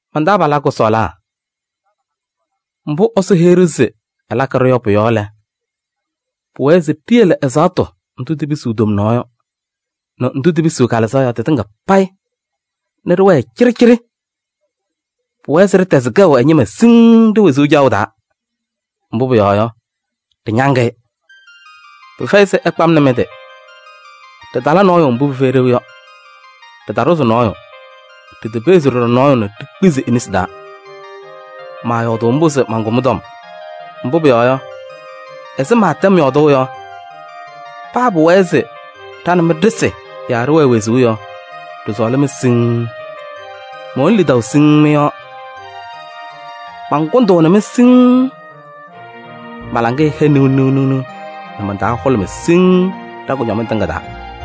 Man-taabalaa kʋsɔɔlaa, mbʋ Ɛsɔ heyi-ɖʋ se ɛlakɩ-ɖʋ yɔ pʋ-yɔɔ lɛ, pɩwɛɛ se ɖiyele ɛzaɣtʋ ndʋ tipisiɣ tomnaɣ yɔ nɛ ndʋ tipisiɣ kalɩzaɣ yɔ tɩtɩŋa payɩ nɛ ɖɩwɛɛ cɩɖɩcɩɖɩ. Pʋwɛɛ se ɖɩtɛzɩ kɛʋ ɛ-ñɩma siŋŋ ɖe-wezuu caɣʋ taa. Mbʋ pʋyɔɔ yɔ, ɖɩñaŋ-ɩ. Pɩfɛyɩ se ɩkpa-m nɛ mɩ-tɩ. Ɖɩtala nɔɔyʋ mbʋ pɩfɛyɩ ɖeu yɔ. Ɖɩtaɖʋzɩ nɔɔyʋ, ɖitepeɣzi ɖɔɖɔ nɔɔyʋ nɛ ɖikpizi e-nesi taa. Maayɔɔdʋʋ mbʋ se mankʋ mɩ-tɔm. Mbʋ pʋyɔɔ yɔ, ɛzɩ mɛntɛm yɔɔdʋʋ yɔ, paa pʋwɛɛ se ɖa nɛ mɩ ɖɩsɩ yaa ɖɩwɛɛ wezuu yɔ, ɖɩsɔɔlɩ-mɩ siŋŋ. Mɛwɛnɩ lidaʋ siŋŋ mɩ-yɔɔ, mankʋndʋʋnɩ-mɩ siŋŋ. Ma-laŋɩyɛ hɛ niɣniɣ nɛ man-taa hʋlʋmɩ siŋŋ ɖa-kʋñɔmɩŋ tɩŋa taa.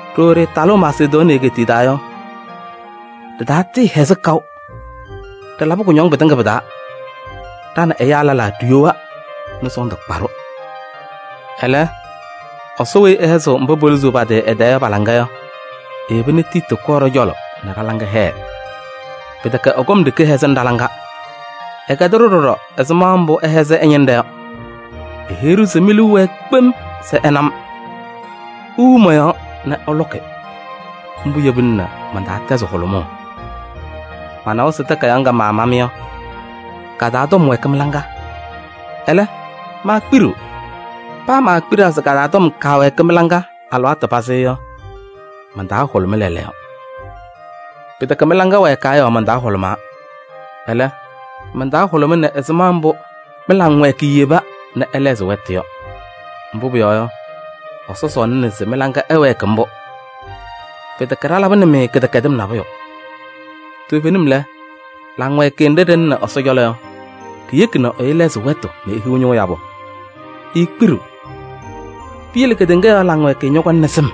Ɖooo ɖɩtalʋʋ Masedonii egeetiye taa yɔ, ɖɩtatɩɩhɛzɩ kaʋ. Ɖɩlabɩ kʋñɔŋ pɩtɩŋa pɩ-taa: ɖa nɛ ɛyaa lɛlaa ɖiyowa nɛ sɔɔndʋ kpa-ɖʋ. Ɛlɛ, Ɛsɔ weyi ɛhɛzɩɣ mba poluzuu pa-tɩ ɛ-tɛɛ yɔ pa-laŋa yɔ, eyeba nɛ Tiiti kɔɔ ɖɔ-cɔlɔ nɛ ɖa-laŋa hɛɛ. Pɩtɛkɛ ɛ-kɔm ɖeke hɛzɩnɩ ɖa-laŋa. Ɛkɛdɩ-ɖʋ ɖɔɖɔ ɛzɩma mbʋ ɩhɛzɩ ɛ-ñɩnɖɛ yɔ. Eheyi-ɖʋ se mi-liu wɛɛ kpem se ɩna-m, iwiɣ mɔ-yɔɔ nɛ ɩlʋkɩ. Mbʋ yebina nɛ man-taa tɛzɩ hʋlʋmʋʋ. Manawa se takayaɣ ŋga maama-mɩ yɔ, ka-taa tɔm wɛɛkɩ mɩ-laŋa, ɛlɛ, maakpiɖiɣ. Paa maakpiɖaa se ka-taa tɔm kaawɛɛkɩ mɩ-laŋa alɩwaatʋ pazɩ yɔ, man-taa hʋlʋmɩ lɛɛlɛɛyɔ. Pɩtɛkɛ mɩ-laŋa wɛɛkaa yɔɔ man-taa hʋlʋmaa. Ɛlɛ, man-taa hʋlʋmɩnɩ ɛzɩma mbʋ mɩ-laŋwɛɛkɩyɛ yeba nɛ ɩlɛɣzɩ wɛtʋ yɔ. Mbʋ pʋyɔɔ yɔ, Ɛsɔ sɔɔlɩna se mɩ-laŋa ɛwɛɛkɩ mbʋ. Pɩtɛkɛ ɖalabɩnɩ-mɩ kɩdɛkɛdɩm nabʋyʋ. Toovenim lɛ, laŋwɛɛkɩyɛ nɖɩ ɖɩlɩnɩ Ɛsɔ cɔlɔ yɔ, ɖiyeki nɛ ɛyʋ lɛɣzɩ wɛtʋ nɛ ehiɣ ñʋʋ yabʋ, eekpiɖiɣ. Piyele kedeŋa laŋwɛɛkɩyɛ ñɔkɔŋnɩ sɩm.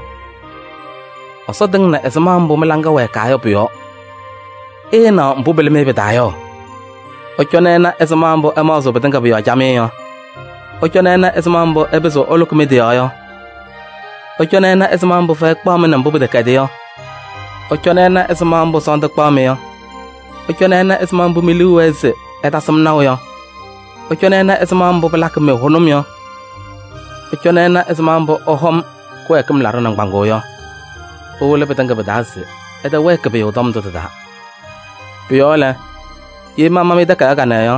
Ɛsɔ tɩŋnɩ ɛzɩma mbʋ mɩ-laŋa wɛɛkaa yɔ pʋ-yɔɔ, ɩɩnaɣ mbʋ pɩlɩ-mɩ pɩ-taa yɔ: ɩcɔnɩ ɩna ɛzɩma mbʋ ɩmaɣzɩɣ pɩtɩŋa pʋ-yɔɔ camɩyɛ yɔ! Ɩcɔnɩ ɩna ɛzɩma mbʋ ɩpɩzɩɣ ɩlʋkɩ mɩ-tɩ yɔɔ yɔ! Ɩcɔnɩ ɩna ɛzɩma mbʋ fɛyɛ kpaɣ-mɩ nɛ mbʋ pɩtɛkɛdɩ yɔ! Ɩcɔnɩ ɩna ɛzɩma mbʋ sɔɔndʋ kpaɣ-mɩ yɔ! Ɩcɔnɩ ɩna ɛzɩma mbʋ mi-liu wɛɛ se ɩtasɩ-m naʋ yɔ! Ɩcɔnɩ ɩna ɛzɩma mbʋ pɩlakɩ-mɩ hʋnʋm yɔ! Ɩcɔnɩ ɩna ɛzɩma mbʋ ɩhɔm kɩwɛɛkɩm laɖʋ nɩŋgbaŋʋʋ yɔ! Ɩwɩlɩ pɩtɩŋa pɩ-taa se ɩtɛwɛɛkɩ pʋyʋ tɔm ndʋ tɩ-taa. Pʋ-yɔɔ lɛ, ye mama-mɩ takayaɣ kanɛ yɔ,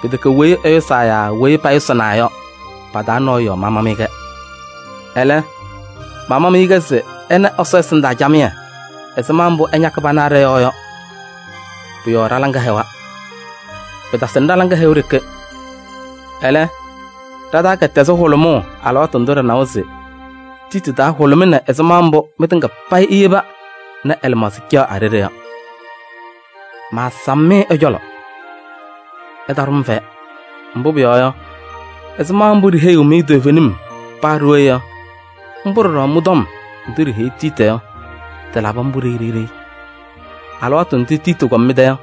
pɩtɛkɛ weyi ɛyʋsaa yaa weyi payʋsɩnaa yɔ, pa-taa nɔɔyʋ yɔɔ mama-mɩ-kɛ. Ɛlɛ, mama-mɩ-kɛ se ɩna Ɛsɔ ɛsɩndaa camɩyɛ ɛzɩma mbʋ ɩñakɩ pana ɖɔ-yɔɔ yɔ. Pʋ-yɔɔ ɖa-laŋa hɛwa. Pɩtasɩnɩ ɖa-laŋa hɛʋ ɖeke. Ɛlɛ, ɖa-taa kɛtɛzɩ hʋlʋmʋʋ alɩwaatʋ ndʋ ɖɩnawa se Tiiti taa hʋlʋmɩnɩ ɛzɩma mbʋ mɩtɩŋa payɩ iyeba nɛ ɛ-lɩmaɣza caɣ a-ɖeɖe yɔ. Maasam-mɩ ɛ-cɔlɔ, ɩtaɖʋ-m fɛyɛ. Mbʋ pʋyɔɔ yɔ, ɛzɩma mbʋ ɖiheyiɣ-mɩ toovenim paa ɖooye yɔ, mbʋ ɖɔɖɔ mɩ-tɔm ndʋ ɖiheyi Tiiti yɔ, tɩlabɩ mbʋ ɖeyi ɖeyi. Alɩwaatʋ ndʋ Tiiti kɔm mɩ-tɛ yɔ,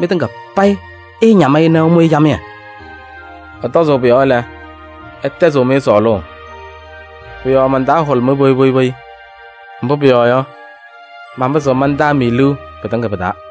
mɩtɩŋa payɩ ɩɩñam-ɩ nɛ ɩmʋ-ɩ camɩyɛ. Ɛtɔzʋʋ pʋ-yɔɔ lɛ, ɛtɛzɩɣ-mɩ sɔɔlʋʋ. Pʋ-yɔɔ man-taa hʋlʋmɩ poyi poyi, mbʋ pʋyɔɔ yɔ, manpɩzɩɣ mantaa-mɩ liu pɩtɩŋa pɩ-taa.